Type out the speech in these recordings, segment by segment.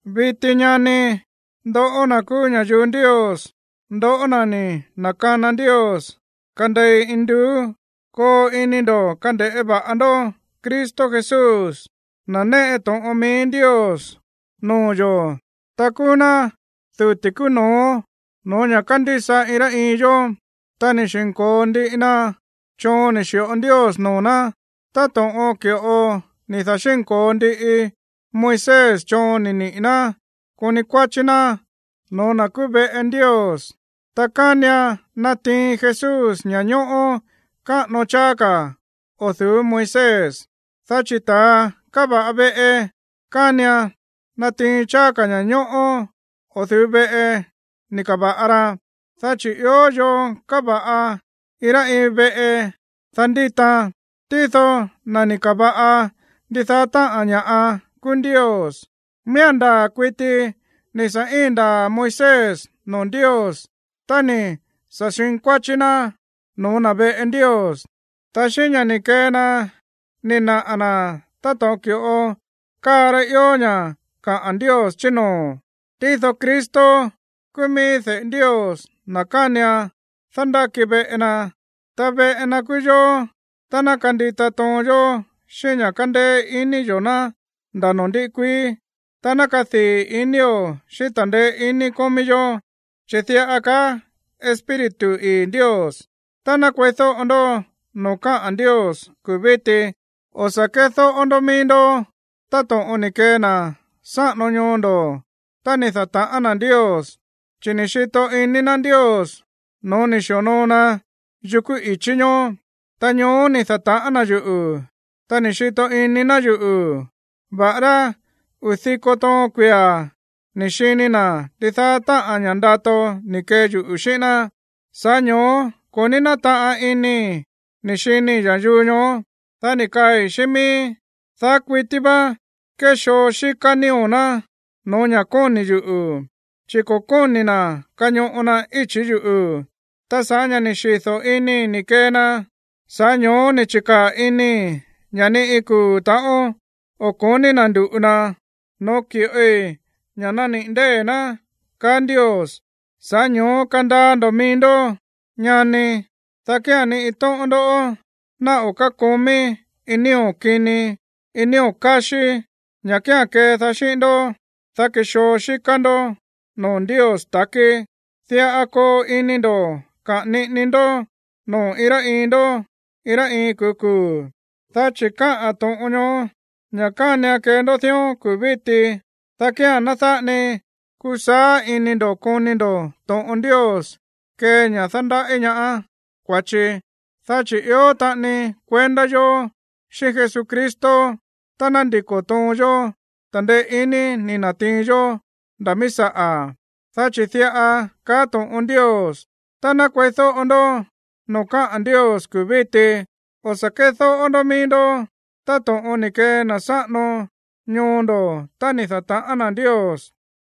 Viti, ñani, ndoꞌó na̱ kúú ña̱yuu Ndios, ndoꞌó na̱ ni̱ na̱kana Ndios kandei induú, koo ini ndo̱ kande̱ꞌé va̱ꞌa ndó Cristo Jesús, na̱ néꞌe to̱ꞌon mií Ndios noo̱ yo̱, ta kúú ná duti̱ kúú no̱ó no̱ó ña̱ kándísa iin rá iin yó. Ta ni̱ da̱xínko̱o ndiꞌi na choon ni̱ xi̱ꞌo Ndios noo̱ ná, táto̱ꞌon ki̱ꞌo ni̱ da̱xínko̱o ndiꞌi Moisés choon ni̱ niꞌi̱ ná koni kuáchí ná no̱ó na̱ kúú veꞌe Ndios. Ta kánian natiin Jesús ña̱ñóꞌó káꞌano cháá ka̱ o̱ du̱ú Moisés, dá chi̱ ta̱a káva̱ꞌa veꞌe kánian natiin cháá ka̱ ña̱ñóꞌó o̱ du̱ú veꞌe ni̱ ka̱va̱ꞌa ra. Dá chi̱ ió yoo káva̱ꞌa iin rá iin veꞌe, dá ndítaan, tído na̱ ni̱ ka̱va̱ꞌa ndidaá táꞌa̱n ña̱ꞌa kúú Ndios. Miía̱n ndaa̱ kuiti ni̱ sa̱ íin ndaa̱ Moisés noo̱ Ndios tá ni̱ sa̱ xinkuáchí ná no̱ó na̱ veꞌe Ndios, ta xíꞌín ña̱ ni̱ kee na ni̱ naꞌa̱ na̱ táto̱ꞌon ki̱ꞌo káa rá ió ña̱ kaꞌa̱n Ndios chí noo̱. Tído Cristo kúú mií de̱ꞌe Ndios, na̱ kánian dándáki veꞌe na. Ta veꞌe na kúú yóó tá ná kandita toon yó xíꞌín ña̱ kándéé iní yo̱ ná nda̱ noo̱ ndiꞌi kuií, ta ná kadii̱ inío̱ xíꞌín ta̱ndeé iní kómí yó. Chi̱ diꞌa kaá Espíritu ii̱ Ndios: Tá ná kueídóꞌo ndó noo̱ káꞌa̱n Ndios kuu̱ víti, dá kía̱n o̱ sa̱ kédóꞌó ndó mií ndó táto̱ꞌon ni̱ kee na̱ sáꞌano ñoo ndo̱ tá ni̱ da̱ta̱ꞌán na̱ Ndios, chi̱ ni̱ xito iní ná Ndios no̱ó ni̱ xi̱onoo na yukú i̱chí ñoó. Ta ñoó ni̱ da̱ta̱ꞌán na̱ yuꞌu̱, ta ni̱ xito iní ná yuꞌu̱, va̱ꞌará uu̱ diko toon kuia̱ ni̱ xini na̱ ndidaá táꞌa̱n ña̱ ndato ni̱ kee yuꞌu̱ xíꞌín ná. Sa̱ꞌá ño̱ó ko̱ ní nátaꞌan inii̱ ni̱ xinii̱ ña̱yuu ñoó, dá ni̱ kaai̱ xíꞌín mííí: “Daá kuití vá kéxoo xíká nío̱ ná no̱ó ña̱ kóni̱ yuꞌu̱, chi̱ ko̱ kóni̱ na̱ kañoꞌo na íchi̱ yuꞌu̱.” Ta sa̱ꞌá ña̱ ni̱ xido̱ inii̱ ni̱ kee na, sa̱ꞌá ño̱ó ni̱ chi̱kaa̱ inii̱ ña̱ ni iin kuu̱ ta̱ꞌón o̱ ko̱ní na̱ ndu̱ꞌu na no̱ó ki̱ꞌoi ña̱ naniꞌi̱ ndée̱ ná, kaá Ndios. Sa̱ꞌá ño̱ó kandaa ndo̱ mií ndó, ñani, dá kía̱n ni iin tóꞌón ndó ná o̱ kákomí iin nío̱ kini, iin nío̱ káxí, ña̱ kía̱n kedaá xíꞌín ndó, dá kexoo xíká ndó noo̱ Ndios ta̱kí. Diꞌa koo ini ndo̱ kaꞌa̱n niꞌini ndó noo̱ iin rá iin ndó iin rá iin kuu̱ kuu̱. Dá chi̱ káꞌa̱n to̱ꞌon ñoó ña̱ kánian kee ndó dión kuu̱ víti, dá kía̱n ná dáꞌa ni kusaá ini ndo̱ koni ndo̱ to̱ꞌon Ndios kee ña̱ dándaꞌí ñaá kua̱chi. Dá chi̱ ió taꞌani kuendá yo̱ xíꞌín Jesucristo tá ná ndiko̱ toon yó ta̱ndeé iní ni̱ na̱tiin yó nda̱ míí saꞌa̱. Dá chi̱ diꞌa kaá to̱ꞌon Ndios: Tá ná kueídóꞌo ndó noo̱ káꞌa̱n Ndios kuu̱ víti, dá kía̱n o̱ sa̱ kédóꞌó ndó mií ndó táto̱ꞌon ni̱ kee na̱ sáꞌano ñoo ndo̱ tá ni̱ da̱ta̱ꞌán na̱ Ndios.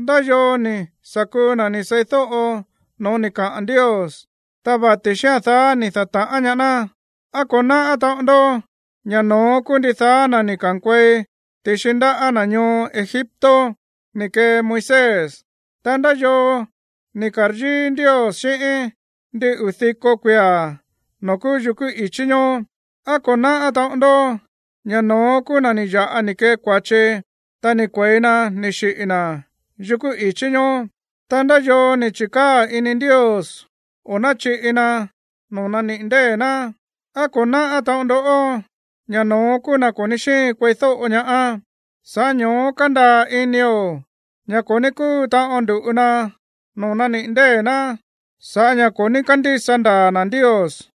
¿Ndá yoo ni̱ sa̱ kuu na̱ ni̱ seídóꞌo no̱ó ni̱ kaꞌa̱n Ndios, ta vati̱ xía̱n daá ni̱ da̱ta̱ꞌán ñaá ná? ¿Á ko̱ náꞌá taꞌon ndó ña̱ no̱ón kúú ndidaá na̱ ni̱ ka̱nkuei ti̱xi ndaꞌá na̱ ñoo Egipto ni̱ kee Moisés? Ta, ¿ndá yoo ni̱ ka̱ryíí Ndios xíꞌín ndin uu̱ diko kuia̱ noo̱ kúú yukú i̱chí ñoó? ¿Á ko̱ náꞌá taꞌon ndó ña̱ no̱ón kúú na̱ ni̱ ya̱ꞌa ni̱ kee kua̱chi, ta ni̱ kue̱i na ni̱ xiꞌi̱ na̱ yukú i̱chí ñoó? Ta, ¿ndá yoo ni̱ chi̱kaa̱ ini Ndios o̱ náchiꞌi na noo̱ naniꞌi̱ ndée̱ ná? ¿Á ko̱ náꞌá taꞌon ndó ña̱ no̱ón kúú na̱ ko̱ ní xíin kueídóꞌo ñaá? Sa̱ꞌá ño̱ó kándaa̱ inio̱ ña̱ ko̱ ní kúu taꞌon ndu̱ꞌu na noo̱ naniꞌi̱ ndée̱ ná sa̱ꞌá ña̱ ko̱ ní kándísa ndaa̱ na̱ Ndios.